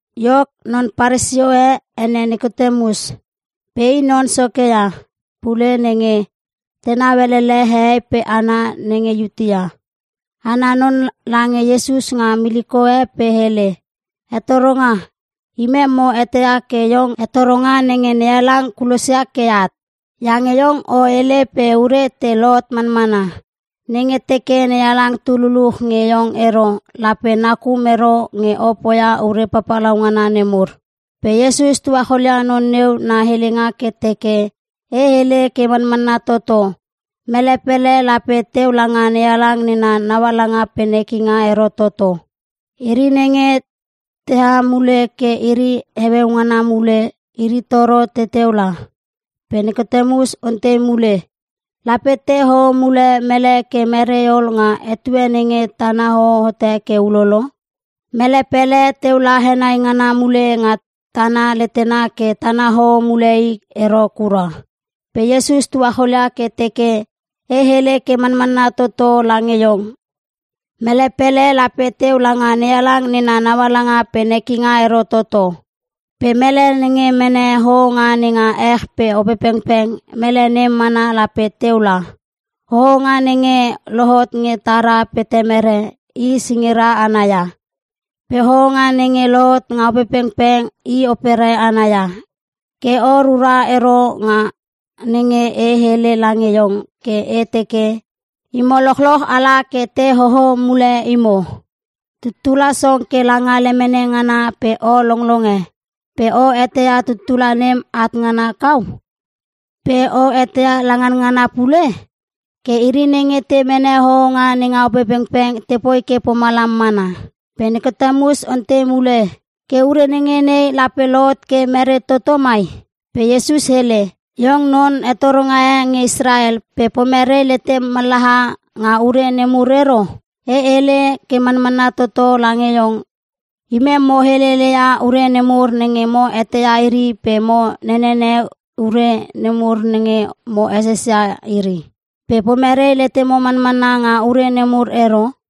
Iok, non Paresio e ene Nikotemus. Pe i non soke ia pule nenge tenau elele hehei pe hana nenge Iutea. Ana non lange Iesus nga miliko e pe hele, “Hetoronga, imem mo eteia ke iong hetoronga nenge NeHalang kulosia ke at. Iange Iong o hele pe ure te lohot manmana. Nenge teke NeHalang tu luluch nge iong ero, lape nakum ero nge o poia ure papalaungana nemur.” Pe Iesus tuacholia non neu na helenga ke teke, “E hele ke manmanna toto. Mele pele lape teu langa NeHalang nena naualanga pe nekinga ero toto. Iri nenge teha mule ke iri heueu ngana mule. Iri toro teteu la.” Pe Nikotemus ontei mule, “Lape te hoho mule mele ke merei ol nga etue nenge tana hoho hote ke ulolo? Mele pele teu la henai ngana mule nga tana letena ke tana hoho mule i ero kura!” Pe Iesus tuacholia ke teke, “E hele ke manmanna toto lange iong, mele pele lape teu langa NeHalang nena naualanga pe nekinga ero toto. Pe mele nenge mene hohonga nenga ech pe Opepengpeng, mele nem mana lape teu la. Hohonga nenge lohot nge tara pe temere, i singira ana ia. Pe hohonga nenge lohot nga Opepengpeng i opere ana ia. Ke o rura ero nga nenge e hele lange iong ke e teke, ‘Imo lochloch ala ke te hoho mule imo.’ Tuttula song ke langa lemene ngana pe o longlonge. Pe o eteia tuttula nem at ngana kau? Pe o eteia la nganngana pule? Ke iri nenge te mene hohonga nenga Opepengpeng tepoi ke pomalam mana.” Pe Nikotemus ontei mule, “Ke ure nenge nei lape lohot ke mere toto mai?” Pe Iesus hele, “Iong non hetoronga e nge Israel, pe pomerei letem mallaha nga ure nemur ero? E hele ke manmanna toto lange iong, imem mo helele ia ure nemur nenge mo eteia iri pe mo nenene ure nemur nenge mo eses ia iri. Pe pomerei letemo manmanna nga ure nemur ero?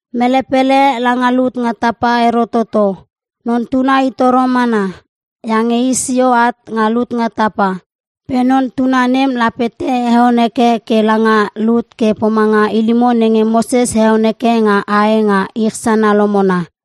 Mele pele langa lut nga tapa ero toto. Non Tuna i toro mana. Iange i sio at nga lut nga tapa. Pe Non Tuna nem lape te heon heke ke langa lut ke pomanga ilimo nenge Moses heon heke nga ae nga ich sana lomona.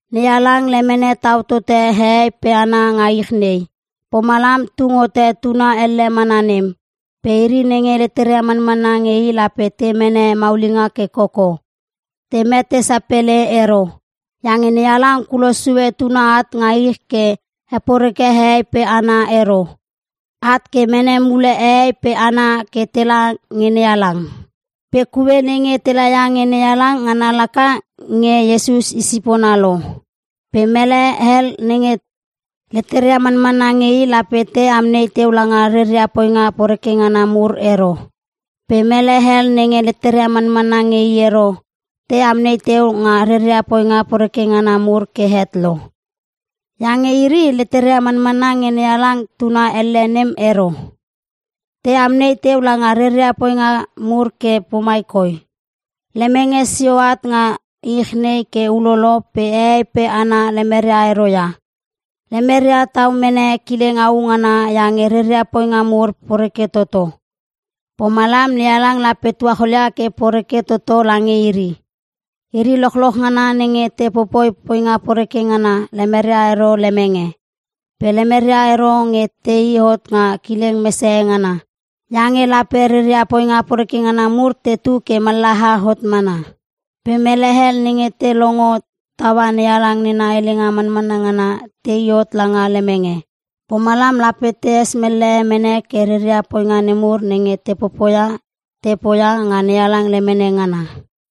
“NeHalang lemene tau tote hehei pe hana nga ich nei. Pomalam tung hote tuna elle mana nem. Pe iri nenge leteria manmanna nge i lape te mene maulinga ke koko. Te mete sapele ero. Iange NeHalang kulos sue Tuna at nga ich ke heporeke hehei pe hana ero. At ke mene mule hehei pe hana ke tela nge NeHalang. Pe kue nenge tela ia nge NeHalang, ngana laka nge Iesus i sipona lo. Pe mele hel nenge leteria manmanna nge i lape te amnei teu langa reria poinga poreke ngana mur ero. Pe mele hel nenge leteria manmanna nge i ero, te amnei teu nga reria poinga poreke ngana mur ke het lo. Iange iri leteria manmanna nge NeHalang Tuna elle nem ero. Te amnei teu langa reria poinga mur ke pomai koi: Lemenge sio at nga ich nei ke ulolo, pe hehei pe hana lemeria ero ia. Lemeria tau mene kileng au ngana iange reria poinga mur poreke toto. Pomalam NeHalang lape tuacholia ke poreke toto lange iri. Iri lochloch ngana nenge te popoi poinga poreke ngana, lemeria ero lemenge. Pe lemeria ero nge tei hot nga kileng mesehe ngana, iange lape reria poinga poreke ngana mur, tetu ke mallaha hot mana. Pe mele hel nenge te longo taua NeHalang nena helenga manmanna ngana, tei hot langa lemenge. Pomalam lape tees mellehe mene ke reria poinga nemur nenge te popoia, te poia nga NeHalang lemene ngana.”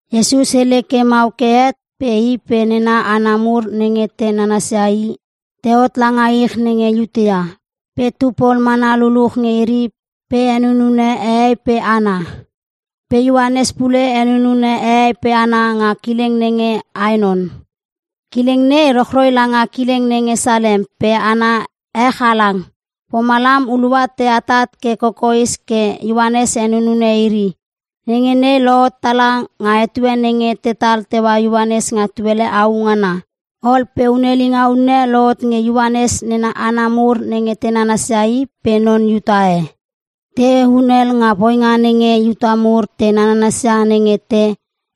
Iesus hele ke mau ke het pe i pe nena hana mur nenge te nananas ia i, tehot langa ich nenge Iutea. Pe tu pol mana luluch nge iri pe henunune hehei pe hana. Pe Ioanes pule henunune hehei pe hana nga kileng nenge Aenon. Kileng nei rochroi langa kileng nenge Salem pe ana ech halang. Pomalam hulua te atat ke kokoes ke Ioanes henunune iri. (Nenge nei lohot tala nga etue nenge tetal teua Ioanes nga tuele au ngana.) Ol pe hunelinga unne lohot nge Ioanes nena hana mur nenge te nanansia i, pe non Iuta e. Te hunel nga poinga nenge Iuta mur te nananasia nenge te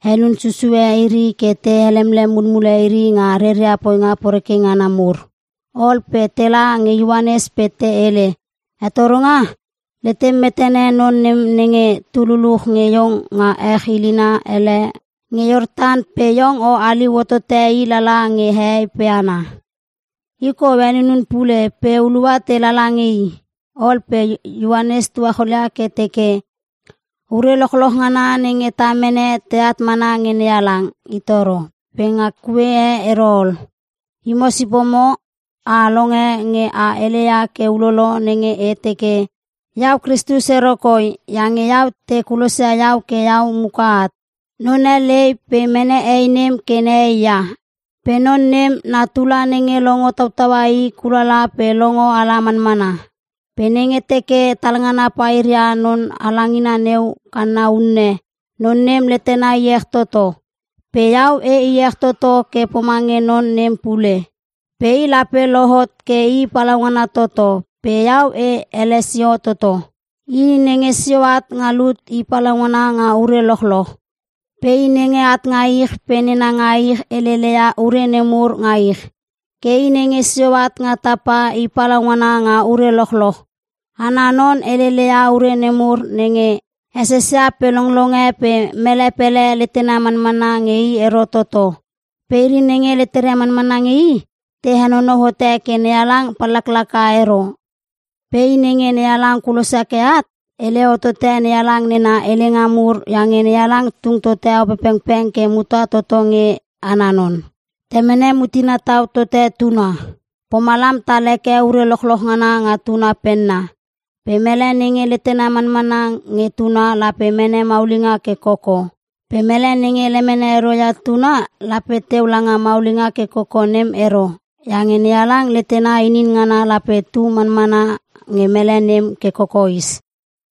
henun susue iri ke te helemlem mulmule iri nga reria poinga poreke ngana mur. Ol pe tela nge Ioanes pe te hele, “Hetoronga, letem metene non nem nenge tu luluch nge iong nga ech ilina hele nge Iortan pe iong o haliu hotote i lala nge hehei pe hana. i kou henunun pule pe hulua te lala nge i.” Ol pe Ioanes tuacholia ke teke, “Ure lochloch ngana nenge ta mene, teat mana nge NeHalang i toro pe nga kue e ero ol. Imo sipomo a longe nge e heleia ke ulolo nenge e teke, ‘Iau Kristus ero koi. Iange iau, te kulosia iau ke iau muka at.’ Non e lei pe mene hei nem ke nehei ia. Pe non nem na tula nenge longo tautaua i, kulala pe longo ala manmana. Pe nenge teke talngana pair ia non halangina neu kanna unne, non nem letena iech toto. Pe iau e iech toto ke pomange non nem pule. Pe i lape lohot ke i palaungana toto. Pe iau, e ele sio toto. “I nenge sio at nga lut i palaungana nga ure lochloch. Pe i nenge at nga ich pe nena nga ich helele ia ure nemur nga ich. Ke i nenge sio at nga tapa i palaungana nga ure lochloch. Ana non helele ia ure nemur nenge e sesia pe longlonge pe mele pele letena manmanna nge i ero toto. Pe iri nenge leteria manmanna nge i, te henonou hote ke NeHalang pallaklaka ero. Pe i nenge NeHalang kulosia ke at, hele hotote NeHalang nena helenga mur iange NeHalang tung tote Opepengpeng ke muta toto nge ana non. Temene mutena tau tote Tuna, pomalam tal heke ure lochloch ngana nga Tuna penna. Pe mele nenge letena manmanna nge Tuna lape mene maulinga ke koko. Pe mele nenge lemene ero ia Tuna lape teu langa maulinga ke koko nem ero. Iange NeHalang letena inin ngana lape tu manmana nge mele nem ke kokoes.”